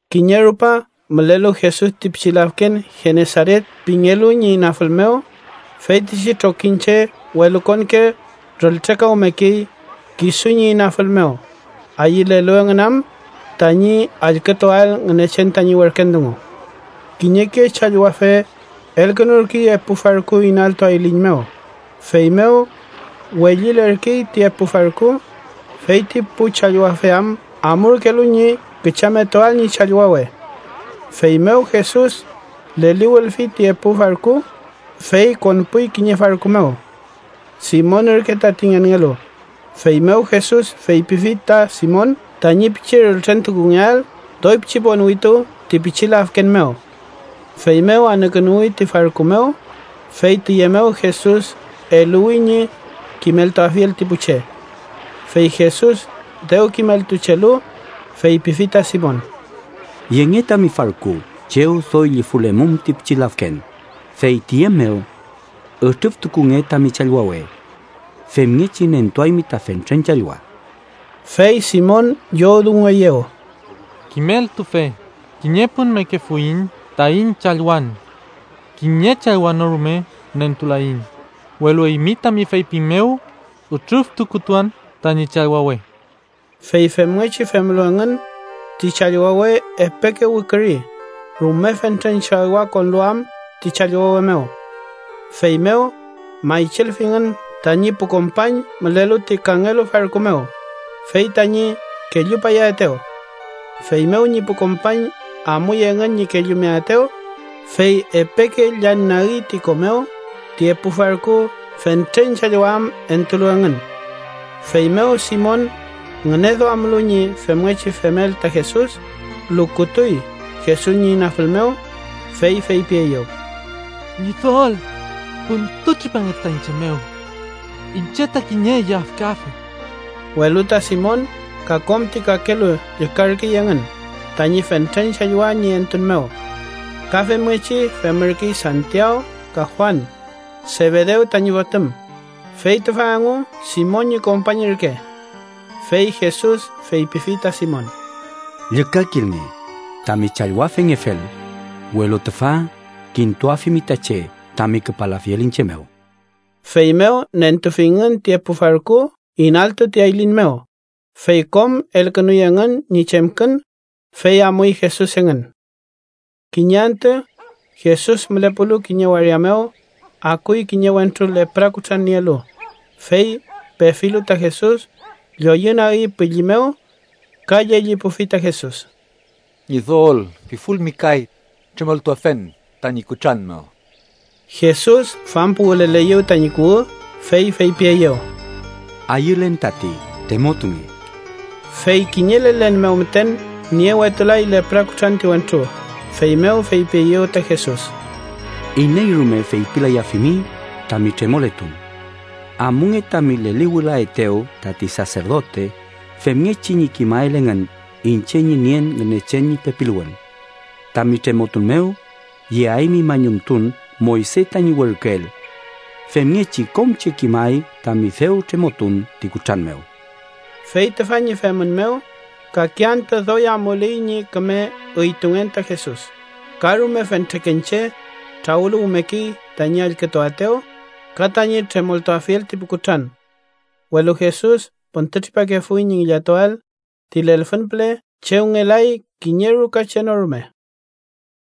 Kiñe rupa, mülelu Jesus ti pichi lafken Genesaret pingelu ñi inafül mew, feytichi trokiñche welukonke rültrekawmekey kisu ñi inafül mew, ayülelu engün am tañi allkütuael Ngünechen tañi werken dungu. Kiñeke challwafe elkünurkey epu farku inaltu ayliñ mew, feymew wellilerkey ti epu farku, feyti pu challwafe am amurkelu ñi küchametuael ñi challwawe. Feymew Jesus leliwülfi ti epu farku, fey konpuy kiñe farku mew. Simon ürke tati ngenngelu, feymew Jesus feypifi ta Simon tañi pichi rültrentukungeael doy pichi ponwitu ti pichi lafken mew. Feymew anükünuwi ti farku mew, fey tüye mew Jesus eluwi ñi kimeltuafiel ti pu che. Fey Jesus dew kimeltuchelu, feypifi ta Simon: —Yenge tami farku chew doy llufülemum ti pichi lafken, fey tiye mew ütrüftukunge tami challwawe. Femngechi nentuaymi ta fentren challwa. Fey Simon llowdungueyew: —Kimeltufe, kiñe pun mekefuiñ taiñ challwan. Kiñe challwa no rume nentulaiñ, welu eymi tami feypin mew, ütrüftukutuan tañi challwawe. Fey femngechi femlu engün, ti challwawe epeke wiküri rume fentren challwa konlu am ti challwawe mew. Feymew maychilfingün tañi pu kompañ mülelu ti kangelu farku mew, fey tañi kellupayaetew. Feymew ñi pu kompañ amuy engün ñi kellumeaetew, fey epeke llañnagi ti ko mew ti epu farku fentren challwa am entulu engün. Feymew Simon ngüneduamlu ñi femngechi femel ta Jesus, lukutuy Jesus ñi inafül mew, fey feypieyew: —¡Ñidol, püntütripange ta iñche mew. Iñche ta kiñe yafkafe! Welu ta Simon ka kom ti kakelu llükarkey engün tañi fentren challwa ñi entun mew. Ka femngechi femürkey Santiaw ka Juan, Sebedew tañi fotüm, fey tüfa engu Simon ñi kompañ ürke. Fey Jesus feypifi ta Simon: —Llükakilnge, tami challwafengefel, welu tüfa kintuafimi ta che tami küpalafiel iñche mew. Feymew nentufingün ti epu farku inaltu ti ayliñ mew, fey kom elkünuy engün ñi chemkün, fey amuy Jesus engün. Kiñe antü, Jesus mülepulu kiñe waria mew, akuy kiñe wentru lepra kutran nielu, fey pefilu ta Jesus, lloyünagi pülli mew ka llellipufi ta Jesus: —Ñidol, pifulmi kay, tremoltuafen tañi kutran mew. Jesus fampuwüleleyew tañi kuwü, fey feypieyew: —Ayülen tati. Tremotunge. Fey kiñe lelen mew müten niewetulay lepra kutran ti wentru, feymew feypieyew ta Jesus: —Iney rume feypilayafimi tami tremoletun. Amunge tami leliwülaetew tati saserdote femngechi ñi kimael engün iñche ñi nien Ngünechen ñi pepiluwün. Tami tremotun mew, yeaymi mañumtun Moyse tañi werküel. Femngechi kom che kimay tami dew tremotun ti kutran mew. Fey tüfa ñi femün mew kake antü doy amuley ñi küme üytungen ta Jesus, ka rume fentreken che trawüluwmekey tañi allkütuaetew ka tañi tremoltuafiel ti pu kutran. Welu Jesus püntütripakefuy ñi ngillatuael ti lelfün püle chew ngelay kiñe ruka che no rume.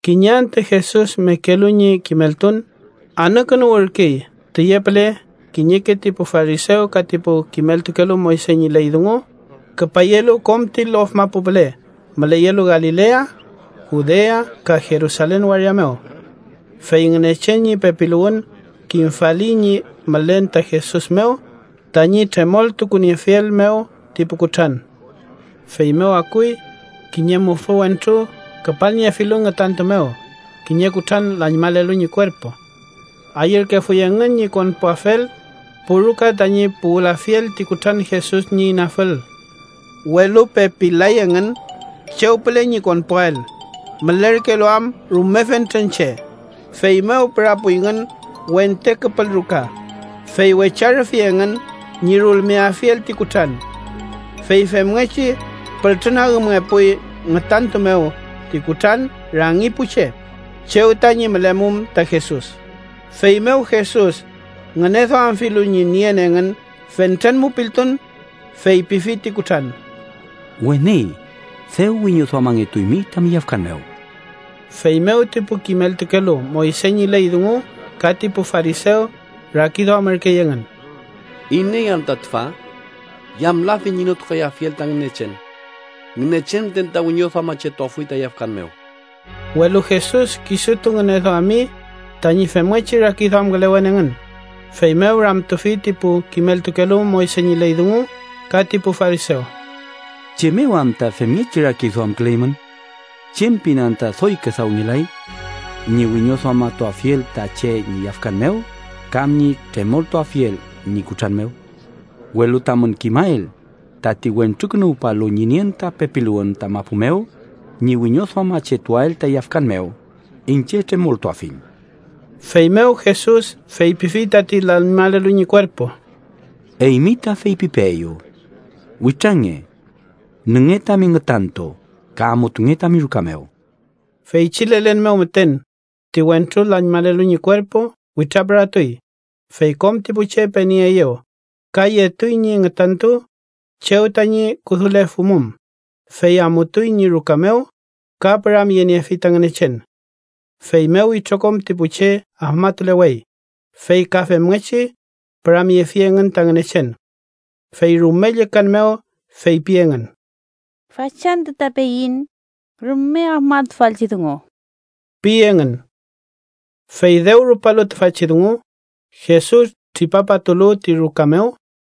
Kiñe antü Jesus mekelu ñi kimeltun, anükünuwürkey tüye püle kiñeke ti pu farisew ka ti pu kimeltukelu Moyse ñi ley dungu küpayelu kom ti lof mapu püle müleyelu Galilea, Judea ka Jerusalen waria mew. Fey Ngünechen ñi pepiluwün kimfali ñi mülen ta Jesus mew tañi tremoltukuniefiel mew ti pu kutran. Feymew akuy kiñe mufü wentru küpalniefilu ngütantu mew kiñe kutran lañmalelu ñi kuerpu. Ayürkefuy engün ñi konpuafel pu ruka tañi puwülafiel ti kutran Jesus ñi inafül, welu pepil-lay engün chew püle ñi konpuael, mülerkelu am rume fentren che. Feymew pürapuyngün wente küpül ruka, fey wecharüfi engün ñi rulmeafiel ti kutran. Fey femngechi pültrü nagümngepuy ngütantu mew ti kutran rangi pu che, chew tañi mülemum ta Jesus. Feymew Jesus ngüneduamfilu ñi nien engün fentren mupiltun, feypifi ti kutran: —Weni, dew wiñoduamangetuymi tami yafkan mew. Feymew ti pu kimeltukelu Moyse ñi ley dungu ka ti pu farisew rakiduamürkey engün: “¿Iney anta tüfa? ¿Yamlafi ñi notukayafiel ta Ngünechen? Ngünechen müten ta wiñoduamachetuafuy ta yafkan mew.” Welu Jesus kisutu ngüneduami tañi femngechi rakiduamkülewen engün, feymew ramtufi ti pu kimeltukelu Moyse ñi ley dungu ka ti pu farisew: —¿Chem mew anta femngechi rakiduamküleymün? ¿Chem pin anta doy küdawngelay: Ñi wiñoduamatuafiel ta che ñi yafkan mew, kam ñi tremoltuafiel ñi kutran mew? Welu tamün kimael tati Wentrukünuwpalu ñi nien ta pepiluwün ta mapu mew ñi wiñoduamachetuael ta yafkan mew, iñche tremoltuafiñ. Feymew Jesus feypifi tati lañmalelu ñi kuerpu: —Eymi ta feypipeeyu: Witrange. Nünge tami ngütantu ka amutunge tami ruka mew. Feychi lelen mew müten, ti wentru lañmalelu ñi kuerpu witrapüratuy, fey kom ti pu che penieeyew, ka yetuy ñi ngütantu chew tañi kudulefumum, fey amutuy ñi ruka mew ka püramyeniefi ta Ngünechen. Feymew itrokom ti pu che afmatulewey, fey ka femngechi püramyefi engün ta Ngünechen. Fey rume llükan mew feypi engün: —Fachantü ta peiñ rume afmatufalchi dungu ―pi engün. Fey dew rupalu tüfachi dungu, Jesus tripapatulu ti ruka mew,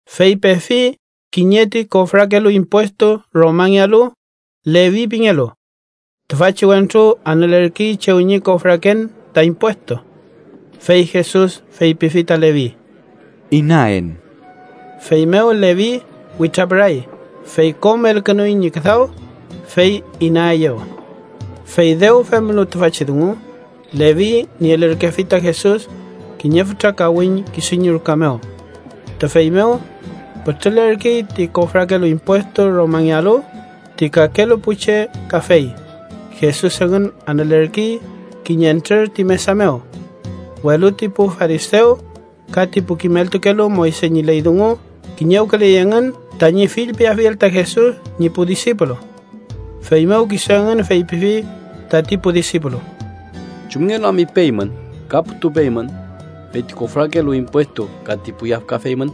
fey pefi kiñe ti kofrakelu impuestu Romangealu, Levi pingelu. Tüfachi wentru anülerkey chew ñi kofraken ta impuestu. Fey Jesus feypifi ta Levi: —Inaen. Feymew Levi witrapüray, fey kom elkünuy ñi küdaw, fey inaeyew. Fey dew femlu tüfachi dungu, Levi nielürkefi ta Jesus kiñe fütra kawiñ kisu ñi ruka mew. Tüfey mew pütrülerkey ti kofrakelu impuestu Romangealu, ti kakelu pu che kafey, Jesus engün anülerkey kiñentrür ti mesa mew. Welu ti pu farisew ka ti pu kimeltukelu Moyse ñi ley dungu kiñewküley engün tañi fillpiafiel ta Jesus ñi pu disipulu. Feymew kisu engün feypifi tati pu disipulu: —¿Chumngelu am ipeymün ka putupeymün fey ti kofrakelu impuestu ka ti pu yafkafe eymün?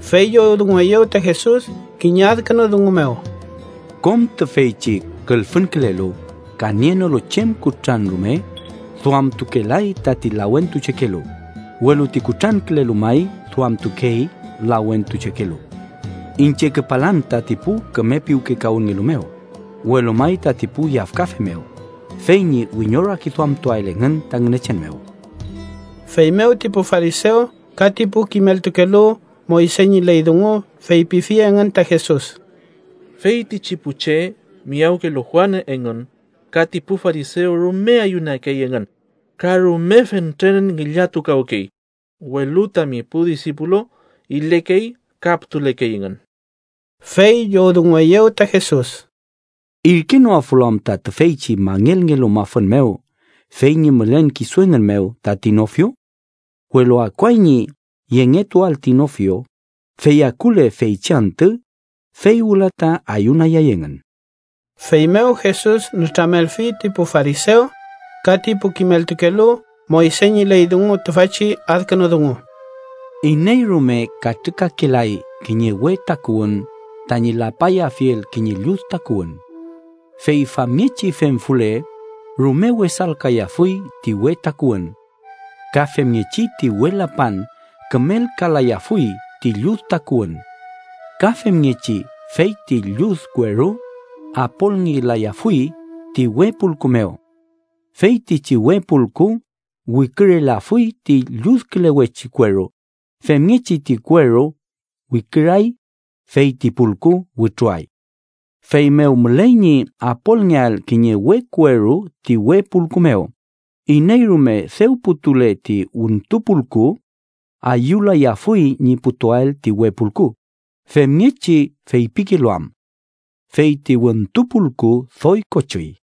Fey llowdungueyew ta Jesus kiñe adkünu dungu mew: —Kom tüfeychi külfünkülelu ka nienolu chem kutran rume duamtukelay tati lawentuchekelu, welu ti kutrankülelu may duamtukey lawentuchekelu. Iñche küpalan tati pu küme piwkekawünnngelu mew, welu may tati pu yafkafe mew, fey ñi wiñorakiduamtuael engün ta Ngünechen mew. Feymew ti pu farisew ka ti pu kimeltukelu Moyse ñi ley dungu feypifi engün ta Jesus: —Feytichi pu che miyawkelu Juan engün ka ti pu farisew rume ayunakey engün ka rume fentren ngillatukawkey, welu tami pu disipulu ilekey ka putulekey engün. Fey llowdungueyew ta Jesus: —¿Irkenoafulu anta tüfeychi mangelngelu mafün mew fey ñi mülen kisu engün mew tati nofio? Welu akuay ñi yengetuael ti nofio, fey akule feychi antü, fey wüla ta ayunayay engün. Feymew Jesus nütramelfi ti pu farisew ka ti pu kimeltukelu Moyse ñi ley dungu tüfachi adkünu dungu: —Iney rume katrükakelay kiñe we takuwün tañi lapayafiel kiñe llud takuwün. Fey famngechi femfule, rume wesalkayafuy ti we takuwün. Ka femngechi, ti we lapan kümelkalayafuy ti llud takuwün. Ka femngechi feyti llud kueru apolngelayafuy ti we pulku mew. Feytichi we pulku wikürelafuy ti lludkülewechi kueru, femngechi ti kueru wiküray, fey ti pulku wütruay. Feymew müley ñi apolngeael kiñe we kueru ti we pulku mew. Iney rume dew putule ti wüntu pulku ayülayafuy ñi putuael ti we pulku, femngechi feypikelu am: ‘fey ti wüntu pulku doy kochüy.’